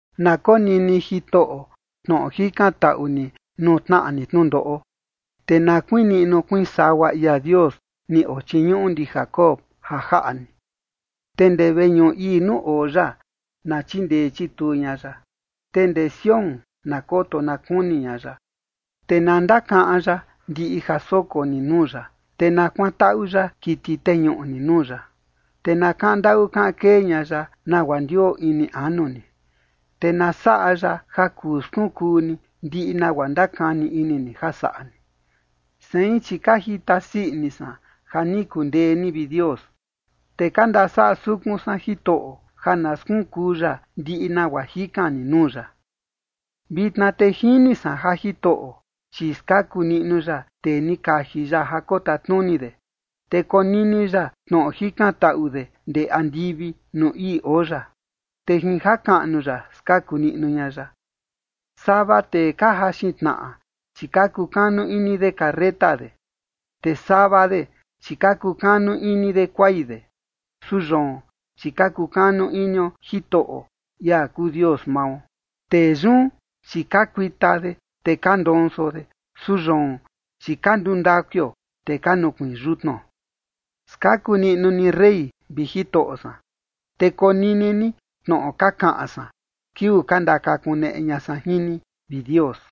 Na konini Jitoꞌo tnoꞌo jikantaꞌu ni nuu tnaꞌa ni tnundoꞌo, te na kuiin niꞌnu kuiin sagua ia Dios ni ochiñuꞌu ndi Jacob ja jaꞌa ni. Te ndee veñuꞌu ii nuu oo ya, na chindee chituu ña ya, te ndee Sión na koto na kuni ña ya. Te na ndakaꞌan ya ndiꞌi ja soko ni nuu ya, te na kuantaꞌu ya kiti teñuꞌu ni nuu ya. Te na kaꞌan ndaꞌu kaꞌan kee ña ya nagua ndioo ini anu ni, te na saꞌa ya ja kuu skunkuu ni ndiꞌi nagua ndakani ini ni ja saꞌa ni. Sein, chi ka jita sii ini san ja ni kundee ni, vi Dios. Te ka ndasaꞌa sukun san Jitoꞌo, ja na skunkuu ya ndiꞌi nagua jikan ni nuu ya. Vitna te jini san ja Jitoꞌo, chi skaku niꞌnu ya tee ni kaji ya ja kotatnuni de, te konini ya tnoꞌo jikantaꞌu de ndee andivi nuu ii oo ya, te jin jakaꞌnu ya skaku niꞌnu ña ya. Sava tee ka jaxin tnaꞌa, chi ka kukanu ini de carreta de, te sava de, chi ka kukanu ini de kuai de, su yoon, chi ka kukanu inio Jitoꞌo, ia kuu Dios mao. Tee yun, chi ka kuita de, te ka ndonso de, su yoon, chi ka nduu ndakuio, te ka nukuiin yutnuo. Skaku niꞌnu ni rey, vi Jitoꞌo san, te konini ni tnoꞌo ka kaꞌan san kiuu ka ndakakuneꞌe ña san jin ni, vi Dios.